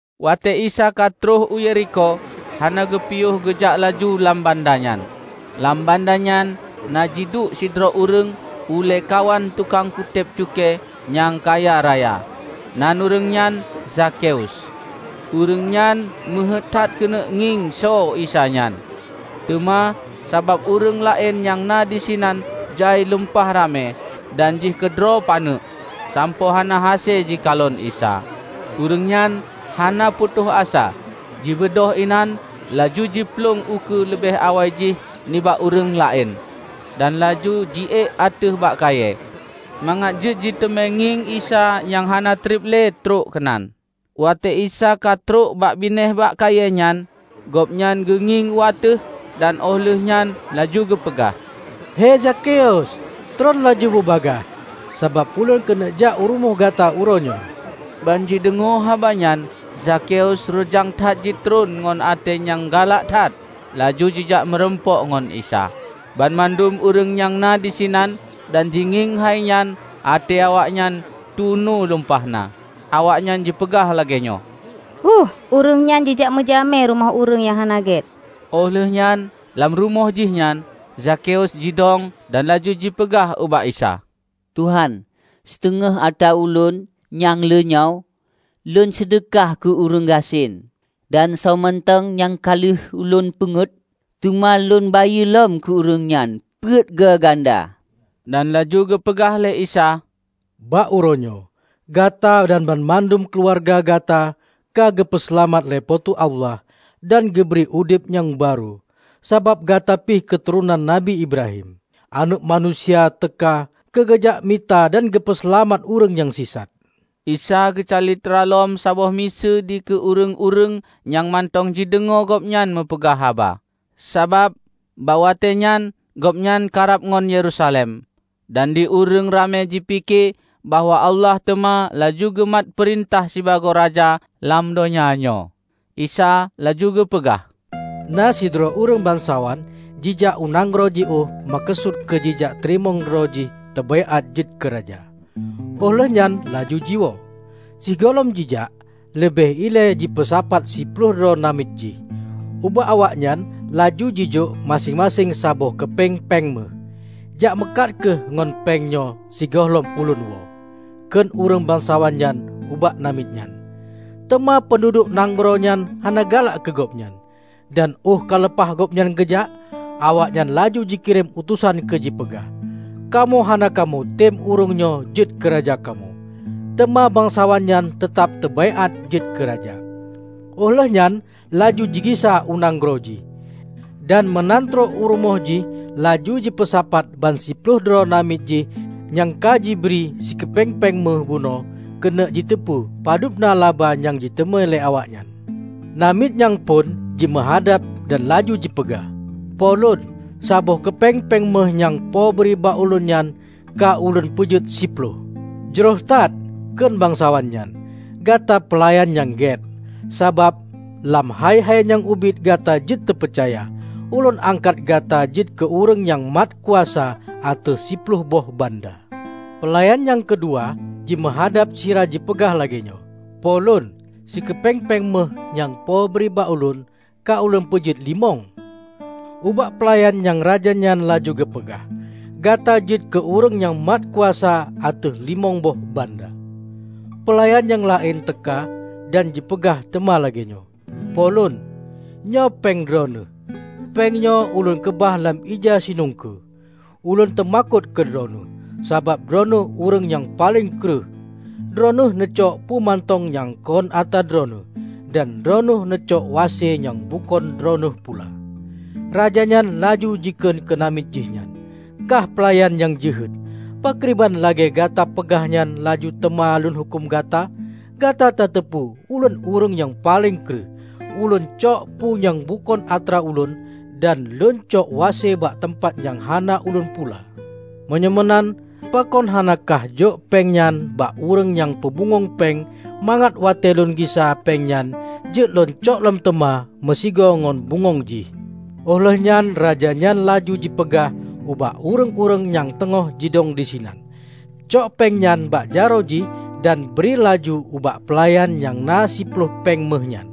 Watée Isa ka troh u Yerikho, hana geupiôh geujak laju lam banda nyan. Lam banda nyan na jiduek sidroe ureuëng ulée kawan tukang kutéb cukée nyang kaya raya, nan ureuëng nyan Zakheus. Ureuëng nyan meuheuét that keuneuk ngieng soe Isa nyan, teuma sabab ureuëng laén nyang na disinan jai lumpah ramé dan jih keudroe paneuk, sampoe hana hase jikalon Isa. Ureuëng nyan hana putôh asa, jibeudôh inan laju jiplueng ukeue leubeh awai jih nibak ureuëng laén, dan laju jiék ateueh bak kayée, mangat jeuet jiteumé ngieng Isa nyang hana treb le trok keunan. Watée Isa ka trok bak binéh bak kayée nyan, Gobnyan geungieng u ateueh dan óh lheuehnyan laju geupeugah, "Hei Zakheus, treun laju bubagaih! Sabab ulôn keuneuk jak u rumoh gata uroe nyoe." Ban jideungoe haba nyan Zakheus reujang that jitreun ngon até nyang galak that laju jijak meurumpok ngon Isa. Banmandum ureuëng nyang na disinan dan jingieng hai nyan até awaknyan tunu lumpah na. Awaknyan jipeugah lagée nyoe, "Héueh! Ureuëng nyoe jijak meujamé u rumoh ureuëng hana gét!" Óh lheuehnyan, lam rumoh jih nyan, Zakheus jidông dan laju jipeugah ubak Isa, "Tuhan, siteungoh atra ulôn nyang le nyoe lôn seudeukah keu ureuëng gasien; dan soe mantong nyang ka lheueh ulôn peungét, teuma lôn bayeue lom keu ureuëng nyan peuet goe ganda!" Dan laju geupeugah lé Isa, "Bak uroenyoe, gata dan banmandum keuluwarga gata ka geupeu seulamat lé po teu Allah dan geubri udeb nyang barô, sabab gata pih keuturonan Nabi Ibrahim. Aneuëk Manusia teuka keu geujak mita dan geupeuseulamat ureuëng nyang sisat." Isa geucalitra lom saboh miseue dikeue ureuëng-ureuëng nyang mantong jideungoe Gobnyan meupeugah haba. Sabab, bakwatée nyan gobnyan karab ngon Yerusalem, dan di ureuëng ramé jipike bahwa Allah teuma laju geumat peurintah sibagoe Raja lam donya nyoe. Isa laju geupeugah, "Na sidroe ureuëng bansawan jijak u nanggroe jiôh meukeusut keu jijak teurimong droe jih teubaiát jeuet keu raja, óh lheueh nyan laju jiwoe. Sigohlom jijak, leubeh ilée jipeusapat siploh droe namiet jih, ubak awaknyan laju jijok maséng-maséng saboh keupeng péng méuh. 'Jak meukat kheueh ngon péng nyoe sigohlom ulôn woe,' kheun ureuëng bansawan nyan ubak namiet jih. Teuma peunduduek nanggroe nyan hana galak keu gobnyan. Dan óh ka leupah gobnyan geujak, awaknyan laju jikirém utosan keu jipeugah, 'Kamoe hana kamoetem ureuëng nyoe jeuet keuraja kamoe.' Teuma bansawan nyan teutab teubaiát jeuet keuraja, óh lheueh nyan laju jigisa u nanggroe jih. Dan meunan trok u rumoh jih laju jipeusapat bansiploh droe namiet jih nyang ka jibri sikeupeng péng méuh bunoe keuneuk jiteupeue padubna laba nyang jiteumé lé awaknyan. Namiet nyang phon jimeuhadab dan laju jipeugah, 'Po lôn, saboh keupeng péng méuh nyang Po bri bak ulôn nyan ka ulôn peujeuet siploh.' 'Jroh that,' kheun bansawan nyan, 'Gata peulayan nyang gét! Sabab lam hai-hai nyang ubit gata jeuet teupeucaya, ulôn angkat gata jeuet keu ureuëng nyang mat kuasa ateueh siploh boh banda.' Peulayan nyang keudua jimeuhadab sira jipeugah lagée nyoe, 'Po lôn, sikeupeng péng méuh nyang Po bri bak ulôn, ka ulôn peujeuet limong.' Ubak peulayan nyang raja nyan laju geupeugah, 'Gata jeuet keu ureuëng nyang mat kuasa ateueh limong boh banda.' Peulayan nyang laén teuka dan jipeugah teuma lagée nyoe, 'Po lôn, nyoe péng Droeneueh; péng nyoe ulôn keubah lam ija sinungkue. Ulôn teumakot keu Droeneueh, sabab Droeneueh ureuëng nyang paleng kreueh. Droeneueh neucok peue mantong nyang kon atra Droeneueh, dan Droeneueh neucok wase nyang bukon Droeneueh pula.' Raja nyan laju jikheun keue namiet jih nyan, 'Kah peulayan nyang jeuhet! Pakriban lagée gata peugah nyan ulôn teuma lôn huköm gata. Gata tateupeue ulôn ureuëng nyang paleng kreueh; ulôn cok peue nyang bukon atra ulôn dan lôncok wase bak teumpat nyang hana ulôn pula. Meunyoe meunan pakon hana kah jok péng nyan bak ureuëng nyang peubungöng péng mangat watée lôn gisa péng nyan jeuet lôncok lom teuma meusigoe ngon bungöng jih?' Óh lheuehnyan raja nyan laju jipeugah ubak ureuëng-ureuëng nyang teungoh jidong disinan, 'Cok péng nyan bak jaroe jih dan bri laju ubak peulayan nyang na siploh péng méuh nyan.'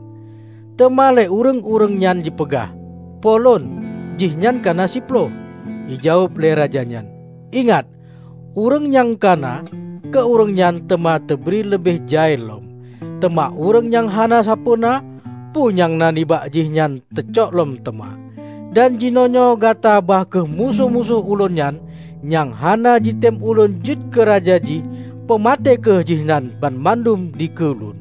Teuma lé ureuëng-ureuëng nyan jipeugah, 'Po lôn, jihnyan kana siploh.' Jijaweueb lé Raja nyan, 'Ingat: Ureuëng nyang kana, keu ureuëng nyan teuma teubri leubeh jai lom. Teuma ureuëng nyang hana sapeuena, peue nyang na nibak jih nyan teucok lom teuma. Dan jinoenyoe gata ba kheueh musoh-musoh ulôn nyan, nyang hana jitem ulôn jeuet keu raja jih. Peumaté kheueh jihnyan banmandum dikeue ulôn!' "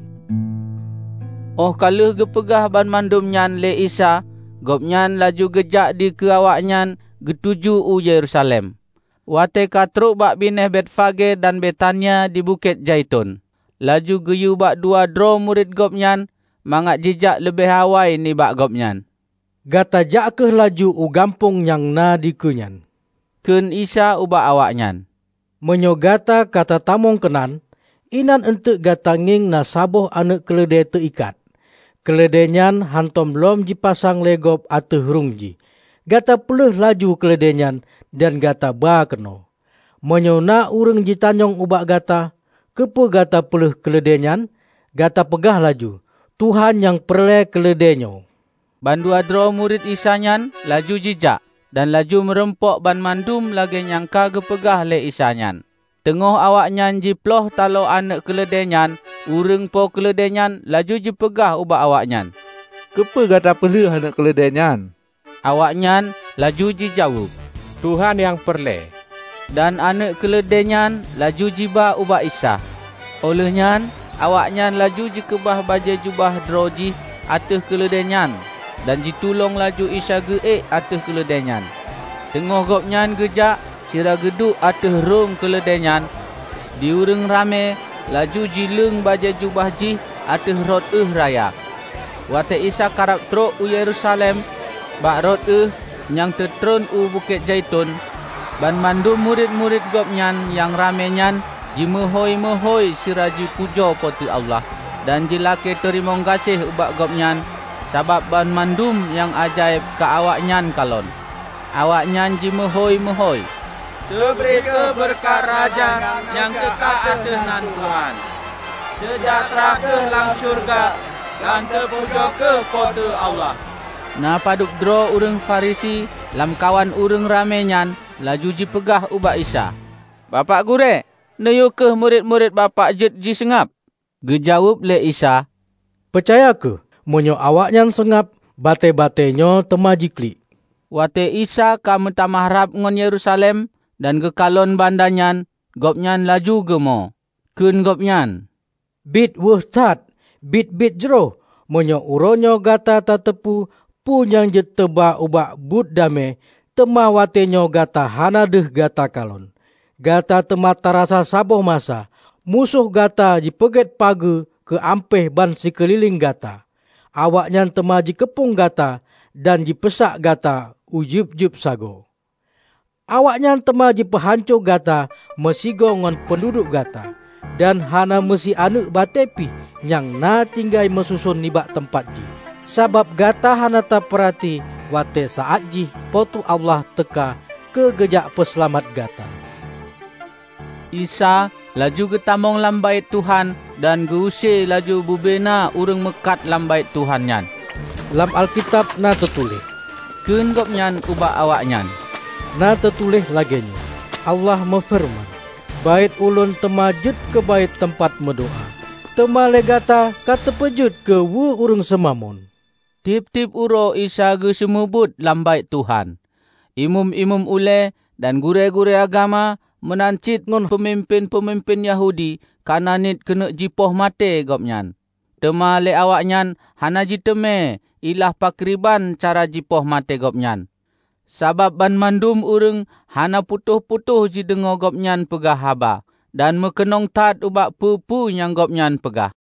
Óh ka lheueh geupeugah banmandum nyan lé Isa gobnyan laju geujak dikeue awaknyan geutuju u Yerusalem. Watée katrok bakbinéh Betfage dan Betania di Bukét Zaiton, laju geuyue bak dua droe murit gobnyan mangat jijak leubeh awai nibak gobnyan. "Gata jak kheueh laju u gampông nyang na dikeue nyan," kheun Isa ubak awaknyan, "meunyoe gata ka tatamong keunan, inan enteuk gata ngieng na saboh aneuëk keuleudée teuikat. Keuleudée nyan hántom lom jipasang lé gob ateueh rhueng jih. Gata peuleueh laju keuleudée nyan dan gata ba keunoe. Meunyoe na ureuëng jitanyong ubak gata, 'Keupeue gata peuleueh keuleudée nyan?' Gata peugah laju, 'Tuhan nyang peureulée keuleudée nyoe.' " Bandua droe murit Isa nyan laju jijak, dan laju meurumpok banmandum lagée nyang ka geupeugah lé Isa nyan. Teungoh awaknyan jiplôh talo aneuëk keuleudée nyan, ureuëng po keuleudée nyan laju jipeugah ubak awaknyan, "Keupeue gata peuleueh aneuëk keuleudée nyan?" Awaknyan laju jijaweueb, "Tuhan nyang peureulée." Dan aneuëk keuleudée nyan laju jiba ubak Isa. Óh lheuehnyan awaknyan laju jikeubah bajée jubah droejih ateueh keuleudée nyan dan jitulông laju Isa geuék ateueh keuleudée nyan. Teungoh gobnyan geujak sira geuduek ateueh rhueng keuleudée nyan, di ureuëng ramé laju jileueng bajée jubah jih ateueh rot ueh raya. Watée Isa karab trok u Yerusalem, bak rot ueh nyang teutreun u Bukét Zaiton, banmandum murit-murit Gobnyan nyang ramé nyan jimeuhôi-meuhôi sira jipujoe Po teu Allah dan jilakée teurimong gaséh ubak Gobnyan sabab banmandum nyang ajaéb nyang ka awaknyan kalon. Awaknyan jimeuhôi-meuhôi, "Teubri kheueh beureukat Raja nyang teuka ateueh nan Tuhan! Seujahteura kheueh lam syeuruga, dan teupujoe kheueh Po teu Allah!" Na padubdroe ureuëng Farisi lamkawan ureuëng ramé nyan laju jipeugah ubak Isa, "Bapak Gurée, neuyue kheueh murit-murit Bapak jeuet jiseungab." Geujaweueb lé Isa, "Peucaya kheueh! Meunyoe awaknyan seungab, batée-batée nyoe teuma jiklik." Watée Isa ka meutamah rab ngon Yerusalem, dan geukalon banda nyan, Gobnyan laju geumo. Kheun Gobnyan, "Biet wéueh that, biet-biet jroh, meunyoe uroenyoe gata tateupeue peue nyang jeuet teuba ubak buet damé! Teuma watéenyoe gata hana deuh gata kalon. Gata teuma tarasa saboh masa, musoh gata jipeugét pageue keu ampéh bansikeulileng gata; awaknyan teuma jikeupông gata dan jipeusak gata u jeueb-jeueb sagoe. Awaknyan teuma jipeuhanco gata meusigoe ngon peunduduek gata; dan hana meusi aneuëk batée pih nyang na tinggai meususon nibak teumpat jih, sabab gata hana tapeurati watée saát jih Po teu Allah teuka keu geujak peuseulamat gata!" Isa laju geutamong lam Baét Tuhan dan geu-use laju bubena ureuëng meukat lam Baét Tuhan nyan. "Lam Alkitab na teutuléh," kheun Gobnyan ubak awaknyan, "na teutuléh lagée nyoe: Allah meufeureuman, 'Baét Ulôn teuma jeuet keu Baét teumpat meudoá.' Teuma lé gata ka tapeujeuet keu weue ureuëng seumamon!" Tieb-tieb uroe Isa geuseumeubeuet lam Baét Tuhan. Imeum-imeum ulée, dan gurée-gurée agama, meunan cit ngon peumimpén-peumimpén Yahudi kana niet keuneuk jipoh maté Gobnyan, teuma lé awaknyan hana jiteumé ilah pakriban cara jipoh maté gobnyan, sabab banmandum ureuëng hana putôh-putôh jideungoe Gobnyan peugah haba, dan meukeunong that ubak peue-peue nyang Gobnyan peugah.